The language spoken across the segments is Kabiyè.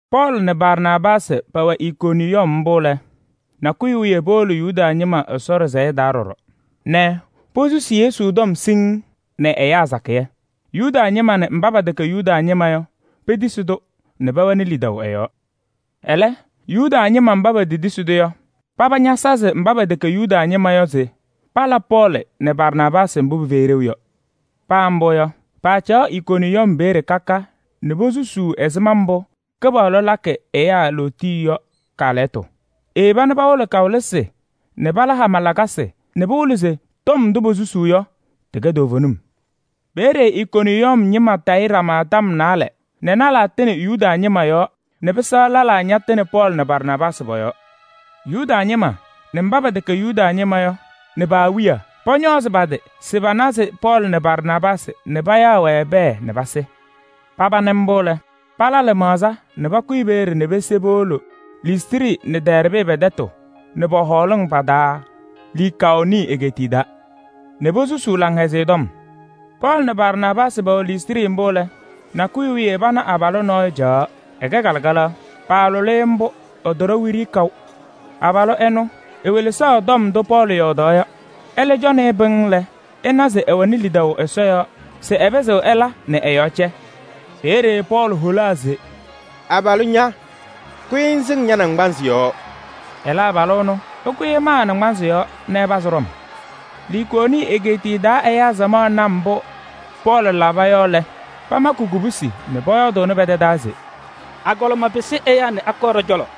Pɔɔlɩ nɛ Barnaabaasɩ pɛwɛ Ikoniyɔm mbʋ lɛ, nakʋyʋ wiye powolo Yuda ñɩma Ɛsɔ ɖɩsɛyɛ taa ɖɔɖɔ nɛ posusi Yesu tɔm siŋŋ nɛ ɛyaa sakɩyɛ: Yuda ñɩma nɛ mba pɛtɛkɛ Yuda ñɩma yɔ petisi-tʋ nɛ pɛwɛnɩ lidaʋ ɛ-yɔɔ. Ɛlɛ, Yuda ñɩma mba petetisi-tʋ yɔ, paba ñasazɩ mba pɛtɛkɛ Yuda ñɩma yɔ se pala Pɔɔlɩ nɛ Barnaabaasɩ mbʋ pɩfɛyɩ ɖeu yɔ. Paa mbʋ yɔ, paacaɣ Ikoniyɔm peeye ka ka nɛ posusuu ɛzɩma mbʋ Kɩpaɣlʋ lakɩ ɛyaa lootiye yɔ kaalɛyɩtʋ. Eyeba nɛ pawɩlɩ kawɩlɩsɩ nɛ pala hama lakasɩ nɛ pɩwɩlɩ se tɔm ndʋ posusuu yɔ, tɩkɛ toovenim. Peeye Ikoniyɔm ñɩma tayɩ ɖama tɔm naalɛ nɛ lɛlaa tɩnɩ Yuda ñɩma yɔɔ nɛ pɩsɛɣ lɛlaa ñatɩnɩ Pɔɔlɩ nɛ Barnaabaasɩ pɔ-yɔɔ. Yuda ñɩma nɛ mba pɛtɛkɛ Yuda ñɩma yɔ nɛ pa-awiya, pɔñɔɔzɩ pa-tɩ se panazɩ Pɔɔlɩ nɛ Barnaabaasɩ nɛ payaɣ-wɛ pɛɛ nɛ pasɩ. Paba nɩ mbʋ lɛ, pala lɩmaɣza nɛ pakʋyɩ peeye nɛ pese powolo Listrɩ nɛ Dɛɛrbɩ pɛ-tɛtʋ nɛ pɔ-hɔɔlɩŋ pa-taa Likaoni egeetiye taa nɛ posusuu Laŋhɛzɩyɛ Tɔm. Pɔɔlɩ nɛ Barnaabaasɩ pɛwɛ Listrɩ mbʋ lɛ, nakʋyʋ wiye pana abalʋ nɔɔyʋ caɣaɣ, ɛkɛ kalɩkalaɣ. Paalʋlɩ-ɩ mbʋ, ɛtɔɖɔ wiɖiyi kaʋ. Abalʋ ɛnʋ ewelesaɣ tɔm ndʋ Pɔɔlɩ yɔɔdaɣ yɔ. Ɛlɛ cɔnɩ-ɩ pɩŋŋ lɛ, ɛna se ɛwɛnɩ lidaʋ Ɛsɔ yɔɔ se ɛpɩzɩɣ ɛla nɛ ɛ-yɔɔ cɛ. Peeye Pɔɔlɩ holaa se: “Abalʋ ña, kʋyɩ ŋsɩŋ ña-naŋgbanzɩ yɔɔ!” Ɛlɛ abalʋ ɛnʋ, ɛkʋyɩ ɛmaa ɛ-naŋgbanzɩ yɔɔ nɛ ɛpazɩ ɖɔm. Likaoni egeetiye taa ɛyaa samaɣ na mbʋ Pɔɔlɩ laba yɔ lɛ, pamakɩ kubusi nɛ pɔyɔɔdʋʋnɩ pɛ-tɛ taa se: “Agɔlɩma pɩsɩ ɛyaa nɛ akɔɔ ɖɔ-cɔlɔ!”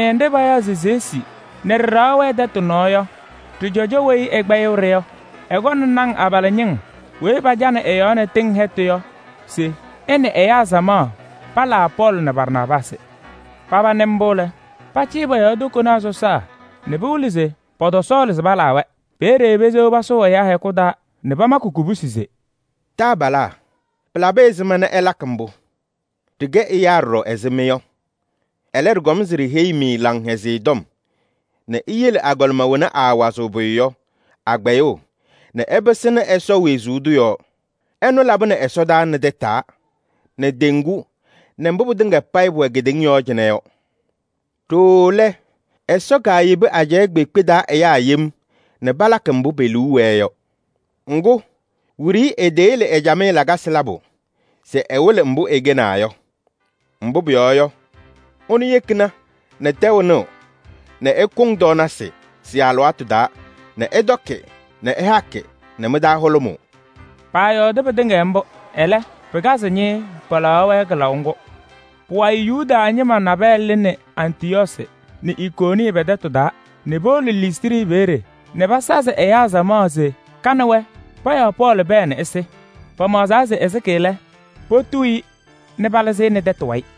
Ɛgɔlɩmɩyɛ nɖɩ payaɣ se Zeesi nɛ ɖɩ-ɖɩɣa wɛ tɛtʋ nɔɔ yɔ, ɖɩ-cɔjɔ weyi ɛkpɛyɩɣ-ɖɩ yɔ, ɛkɔnɩ naŋ abalɩñɩŋ weyi pacanɩ ɩ-yɔɔ nɛ tɩŋ hɛtʋ yɔ se ɛ nɛ ɛyaa samaɣ palaa Pɔɔlɩ nɛ Barnaabaasɩ. Paba nɩ mbʋ lɛ, pacɩyɩ pɔ-yɔɔ tokonaa sɔsaa nɛ pɩwɩlɩ se pɔtɔsɔɔlɩ se palaa-wɛ. Peeye pesewa pasʋʋ ɛyaa hɛkʋ taa nɛ pamakɩ kubusi se: “Taabalaa, pɩlabɩ ɛzɩma nɛ ɩlakɩ mbʋ? Ɖɩkɛ ɛyaa ɖɔɖɔ ɛzɩ mɩ yɔ. Ɛlɛ, ɖɩkɔm se ɖiheyi-mɩ Laŋhɛzɩyɛ Tɔm nɛ iyele agɔlɩma wena aawazɩɣ pʋyʋ yɔ, a-kpɛyʋʋ nɛ ɩpɩsɩnɩ Ɛsɔ wezuu tʋ yɔɔ. Ɛnʋ labɩnɩ ɛsɔdaa nɛ tataa nɛ teŋgu nɛ mbʋ pɩtɩŋa payɩ pʋwɛ kedeŋa yɔɔ cɩnɛ yɔ. Ɖooo lɛ, Ɛsɔ kaayebi ajɛɛ kpeekpe taa ɛyaa yem nɛ palakɩ mbʋ pe-liu wɛɛ yɔ. Ŋgʋ, wiɖiyi eteyele ɛ-camɩyɛ lakasɩ labʋ se ɛwɩlɩ mbʋ ɛkɛnaa yɔ. Mbʋ pʋyɔɔ yɔ, ɛnʋ yekina nɛ tɛʋ nɩɣ nɛ ɩkʋŋ tɔɔnasɩ sɩ-alɩwaatʋ taa nɛ ɩtɔkɩ nɛ ɩhakɩ nɛ mɩ-taa hʋlʋmʋʋ.” Paayɔɔdɩ pɩtɩŋa mbʋ, ɛlɛ, pɩkazɩ ñɩɩɩ palaɣaɣ-wɛ kɩlaʋ ŋgʋ. Pʋwayɩ Yuda ñɩma nabɛyɛ lɩnɩ Antɩyɔɔsɩ nɛ Ikoniyɔm pɛ-tɛtʋ taa nɛ powolo Listrɩ peeye nɛ pasazɩ ɛyaa samaɣ nɛ ka nɛ wɛ payaɣ Pɔɔlɩ pɛɛ se ɛsɩ. Pamaɣzaa se ɛsɩba lɛ, potuu-i nɛ palɩzɩ nɛ tɛtʋ wayɩ.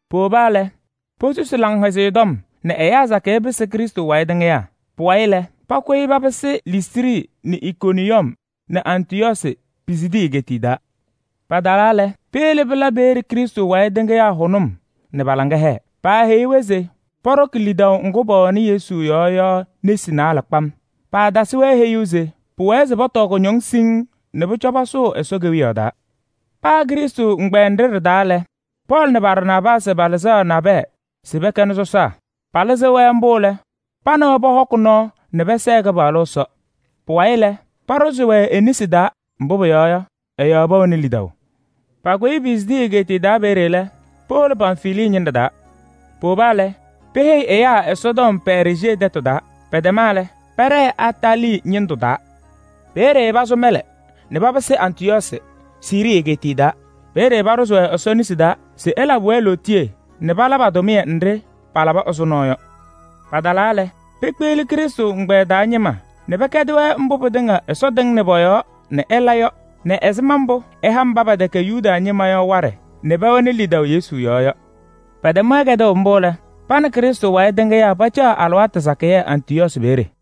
Powoba lɛ, posusi Laŋhɛzɩyɛ Tɔm nɛ ɛyaa sakɩyɛ pɩsɩ Krɩstʋ wayɩ tɩŋɩyaa. Pʋwayɩ lɛ, pakʋyɩ papɩsɩ Listrɩ nɛ Ikoniyɔm nɛ Antɩyɔɔsɩ, Pisidii egeetiye taa. Patalaa lɛ, peyele pɩla peeye Krɩstʋ wayɩ tɩŋɩyaa hʋnʋm nɛ pa-laŋa hɛɛ. Paaheyi-wɛ se pɔɖɔkɩ lidaʋ ŋgʋ pɛwɛnɩ Yesu yɔɔ yɔ nesi naalɛ kpam. Paatasɩ-wɛ heyuu se pʋwɛɛ se pɔtɔɔ kʋñɔŋ siŋŋ nɛ pʋcɔ pasʋʋ Ɛsɔ Kewiyaɣ taa. Paa Krɩstʋ ɛgbɛyɛ nɖɩ ɖɩ-taa lɛ, Pɔɔlɩ nɛ Barnaabaasɩ palɩzaɣ nabɛyɛ se pɛkɛnɩ sɔsaa. Palɩzɩɣ-wɛ mbʋ lɛ, pa nɛ wɛ pɔhɔkɩ nɔɔ nɛ pɛsɛɛ Kɩpaɣlʋ Ɛsɔ. Pʋwayɩ lɛ, paɖʋzɩ-wɛ e-nesi taa, mbʋ pʋyɔɔ yɔ, ɛ-yɔɔ pɛwɛnɩ lidaʋ. Pakʋyɩ Pisidii egeetiye taa peeye lɛ, powolo Pamfilii ñɩnɖɛ taa. Powoba lɛ, peheyi ɛyaa Ɛsɔtɔm Pɛɛrjee tɛtʋ taa, pɛtɛma lɛ, pɛɖɛɛ Atalii ñɩndʋ taa. Peeye pasʋ mɛlɛ nɛ papɩsɩ Antɩyɔɔsɩ, Siirii egeetiye taa. Peeye paaɖʋzɩ-wɛ Ɛsɔ nesi taa se ɛlabɩ-wɛ lootiye nɛ pala pa-tʋmɩyɛ nɖɩ palaba ɛzʋnɔ yɔ. Patalaa lɛ, pekpeɣli Krɩstʋ ɛgbɛyɛ taa ñɩma nɛ pɛkɛdɩ-wɛ mbʋ pɩtɩŋa Ɛsɔ tɩŋnɩ pɔ-yɔɔ nɛ ɛla yɔ nɛ ɛzɩma mbʋ ɛha mba pɛtɛkɛ Yuda ñɩma yɔ waɖɛ nɛ pɛwɛnɩ lidaʋ Yesu yɔɔ yɔ. Pɛtɛm-wɛ kɛdʋʋ mbʋ lɛ, pa nɛ Krɩstʋ wayɩ tɩŋɩyaa pacaɣ alɩwaatʋ sakɩyɛ Antɩyɔɔsɩ peeye.